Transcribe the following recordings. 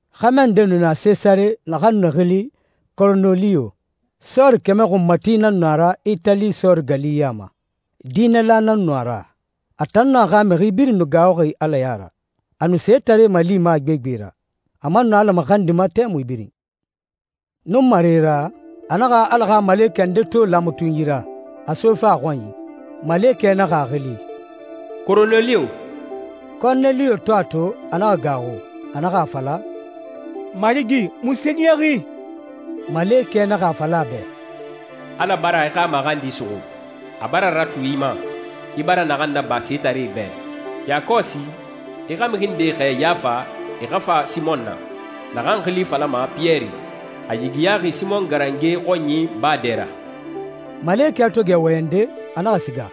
Xɛmɛ nde nu na Sesare naxan nu xili Koroneliyo. Sɔɔri kɛmɛ xunmati nan nu a ra Itali sɔɔri gali ya ma. Diinɛla nan nu a ra. A tan nun a xa mixi birin nu gaaxuxi Ala ya ra. A nu setaree malima a gbegbe ra, a man nu Ala maxandima tɛmui birin. Nunmare ra, a naxa Ala xa malekɛ nde to laamatunyi ra, a sofe a xɔnyi. Malekɛ naxa a xili, «Koroneliyo.» Koroneliyo to a to, a naxa gaaxu. A naxa a fala, «Marigi, munse niyaxi?» Malekɛ naxa a fala a bɛ, «Ala bara i xa maxandi suxu. A bara ratu i ma, i bara naxan naba setaree bɛ. Yakɔsi, i xa mixi ndee xɛɛ Yafa e xa fa Simɔn na, naxan xili falama Piyɛri. A yigiyaxi Simɔn garange xɔnyi baa dɛ ra.» Malekɛ to gɛ wɔyɛnde, a naxa siga.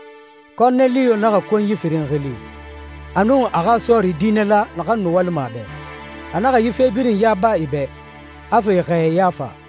Koroneliyo naxa konyi firin xili, a nun a xa sɔɔri diinɛla, naxan nu walima a bɛ. A naxa yi fe birin yaba e bɛ, a fa e xɛɛ Yafa.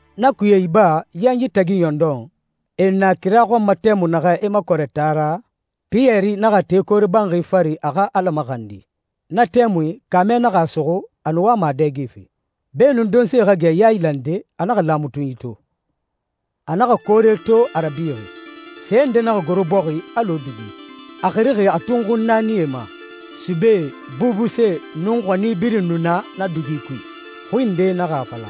Na kuye iba yanyi tagi ɲɔndɔn, e nu na kira xɔn ma tɛmui naxɛ, e makɔrɛ taa ra, Piyɛri naxa te koore banxi fari a xa Ala maxandi. Na tɛmui kaamɛ naxa a suxu, a nu wama a dɛgefe. Beenun donse xa gɛ yailande, a naxa laamatunyi to. A naxa koore to a rabixi, se nde naxa goro bɔxi alɔ dugi, a xirixi a tunxun naanie ma. Subee, bubusee, nun xɔni birin nu na na dugi kui. Xui nde naxa a fala,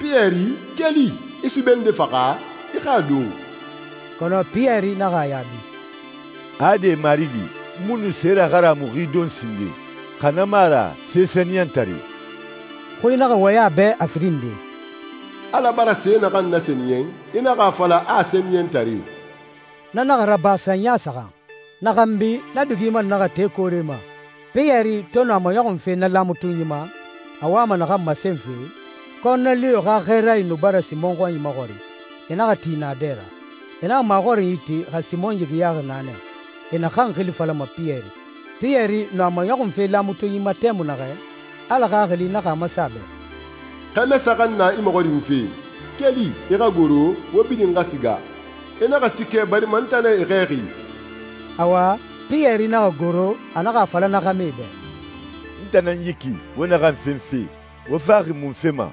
«Piyɛri, keli, i sube nde faxa, i xa a don.» Kɔnɔ Piyɛri naxa a yaabi, «Ade, Marigi. N mu nu se raharamuxi don sinden, xa na mu a ra se sɛniyɛntare.» Xui naxa wɔyɛn a bɛ a firin nde, «Ala bara se naxan nasɛniyɛn i naxa a fala a sɛniyɛntare.» Na naxa raba sanya saxan. Na xanbi, na dugi man naxa te koore ma. Piyɛri to nu a maɲɔxunfe na laamatunyi ma, a wama naxan masenfe, Koroneliyo xa xɛɛrae nu bara Simɔn xɔnyi maxɔrin. E naxa ti naadɛ ra. E naxa maxɔrinyi ti xa Simɔn yigiyaxi naa nɛ, e naxan xili falama Piyɛri. Piyɛri nu a maɲɔxunfe laamatunyi ma tɛmui naxɛ, Ala Xaxili naxa a masen a bɛ, «Xɛmɛ saxan na i maxɔrinfe. Keli, i xa goro, wo birin xa siga. I naxa siikɛ, barima n tan nan e xɛɛxi.» Awa, Piyɛri naxa goro, a naxa a fala na xɛmɛe bɛ, «N tan nan yi ki wo naxan fenfe. Wo faxi munfe ma?»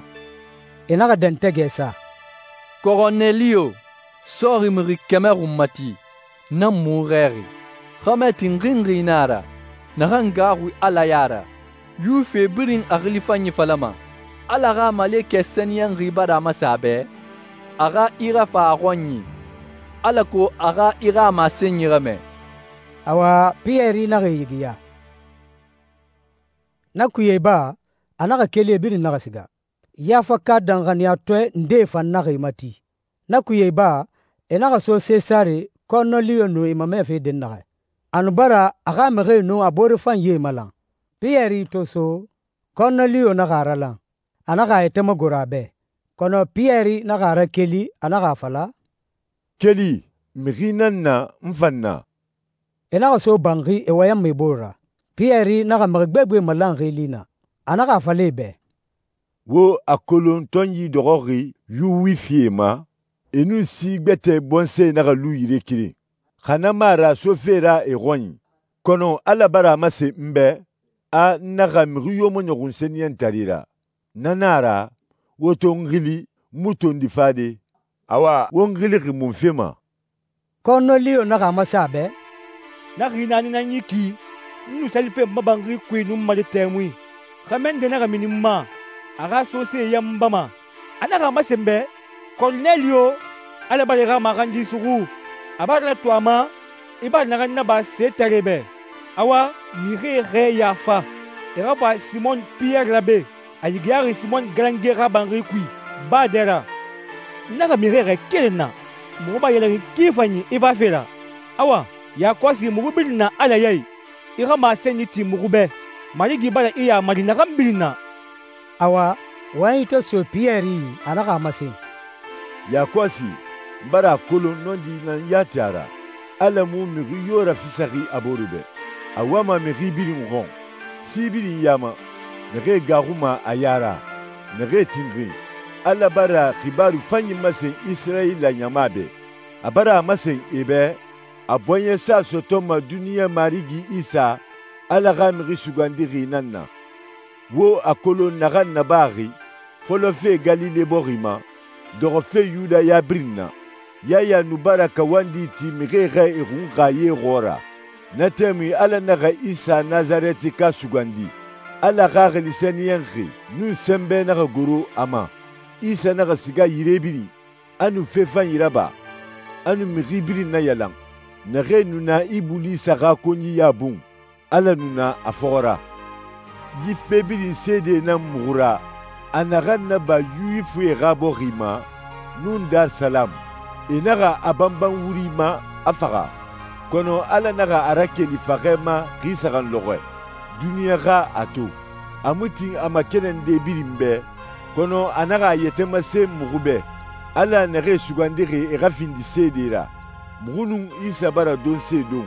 E naxa dɛntɛgɛ sa, «Koroneliyo, sɔɔri mixi kɛmɛ xunmati, nan muxu xɛɛxi. Xɛmɛ tinxinxi na a ra, naxan gaaxuxi Ala ya ra. Yuwifie birin a xili fanyi falama. Ala xa malekɛ sɛniyɛnxi bara a masen a bɛ a xa i rafa a xɔnyi alako a xa i xa masenyi ramɛ.» Awa, Piyɛri naxa e yigiya. Na kuye iba, a naxa keli, e birin naxa siga. Yafaka danxaniyatɔɛ ndee fan naxa e mati. Na kuye iba, e naxa so Sesare, Koroneliyo nu e mamɛfe dɛnnaxɛ. A nu bara a xa mixie nun a boore fanyie malan. Piyɛri to so, Koroneliyo naxa a ralan, a naxa a yɛtɛ magoro a bɛ. Kɔnɔ Piyɛri naxa a rakeli, a naxa a fala, «Keli, mixi nan na n fan na.» E naxa so banxi e wɔyɛnma e bore ra. Piyɛri naxa mixi gbegbe malanxi li naa. A naxa a fala e bɛ, «Wo a kolon tɔnyi dɔxɔxi Yuwifie ma e nun si gbɛtɛ bɔnsɔɛ naxa lu yire keren, xa na mu a ra sofe ra e xɔnyi. Kɔnɔ Ala bara a masen n bɛ a n naxa mixi yo maɲɔxun sɛniyɛntare ra. Na na a ra, wo to n xili, n mu tondi fade. Awa, wo n xilixi munfe ma?» Koroneliyo naxa a masen a bɛ, «Na xi naani nan yi ki, n nu salife n ma banxi kui nunmare tɛmui. Xɛmɛ nde naxa mini n ma, a xa sosee yanbama. A naxa a masen n bɛ, ‹Koroneliyo, Ala bara i xa maxandi suxu. A bara ratu a ma i bara naxan naba setaree bɛ. Awa, mixie xɛɛ Yafa, e xa fa Simɔn Piyɛri ra be. A yigiyaxi Simɔn garange xa banxi kui, baa dɛ ra.› N naxa mixie xɛɛ keren na. Muxu bara ɲɛlɛxin ki fanyi i fafe ra. Awa, yakɔsi muxu birin na Ala ya i. I xa masenyi ti muxu bɛ, Marigi bara i yamari naxan birin na.» Awa, wɔyɛnyi to so Piyɛri yi, a naxa a masen, «Yakɔsi n bara a kolon nɔndi nan yati a ra, Ala mu mixi yo rafisaxi a boore bɛ. A wama mixi birin xɔn, sie birin ya ma, naxee gaaxuma a ya ra, naxee tinxin. Ala bara xibaaru fanyi masen Isirayila ɲama bɛ. A bara a masen e bɛ a bɔɲɛsa sɔtɔma duniɲa Marigi Isa, Ala xa Mixi Sugandixi nan na. Wo a kolon naxan nabaxi fɔlɔfe Galile bɔxi ma, dɔxɔfe Yudaya birin na. Yaya nu bara kawandi ti mixie xa e xunxa ye xɔɔra. Na tɛmui Ala naxa Isa Nasarɛtika sugandi, Ala Xaxili Sɛniyɛnxi nun sɛnbɛ naxa goro a ma. Isa naxa siga yire birin, a nu fe fanyi raba, a nu mixi birin nayalan naxee nu na Ibulisa xa konyiya bun. Ala nu na a fɔxɔ ra.» «Yi fe birin seede nan muxu ra a naxan naba Yuwifie xa bɔxi ma nun Darisalamu. E naxa a banban wuri ma, a faxa. Kɔnɔ Ala naxa a rakeli faxɛ ma xi saxan lɔxɔɛ, duniɲa xa a to. A mu tin a makɛnɛnde birin bɛ, kɔnɔ a naxa a yɛtɛ masen muxu bɛ, Ala naxee sugandixi e xa findi seedee ra. Muxu nun Isa bara donse don,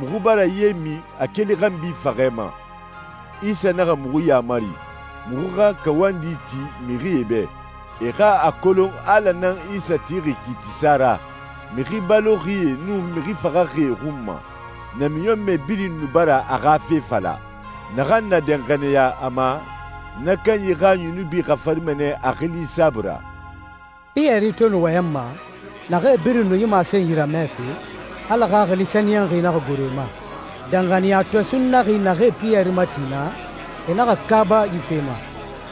muxu bara ye min a keli xanbi faxɛ ma. Isa naxa muxu yamari, muxu xa kawandi ti mixie bɛ, e xa a kolon Ala nan Isa tixi kiitisa ra mixi baloxie nun mixi faxaxie xun ma. Namiɲɔnmɛ birin nu bara a xa fe fala, naxan na danxaniya a ma na kanyi xa yunubi xafarima nɛ a xili saabui ra.» Piyɛri to nu wɔyɛnma, naxee birin nu yi masenyi ramɛfe, Ala Xaxili Sɛniyɛnxi naxa goro e ma. Danxaniyatɔɛ sunnaxie naxee Piyɛri mati naa, e naxa kaaba yi fe ma,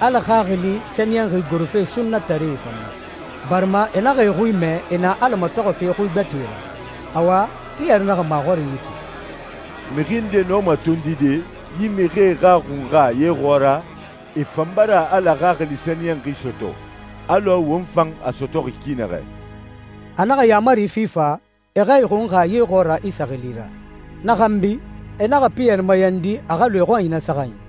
Ala Xaxili Sɛniyɛnxi gorofe sunnataree fan ma, barima e naxa e xui mɛ e na Ala matɔxɔfe xui gbɛtɛe ra. Awa, Piyɛri naxa maxɔrinyi ti, «Mixi nde nɔma tondide yi mixie xa xunxa ye xɔɔra? E fan bara Ala Xaxili Sɛniyɛnxi sɔtɔ alɔ won fan a sɔtɔxi ki naxɛ.» A naxa yaamari fi fa e xa e xunxa ye xɔɔra Isa xili ra. Na xanbi e naxa Piyɛri mayandi a xa lu e xɔnyi na saxanyi.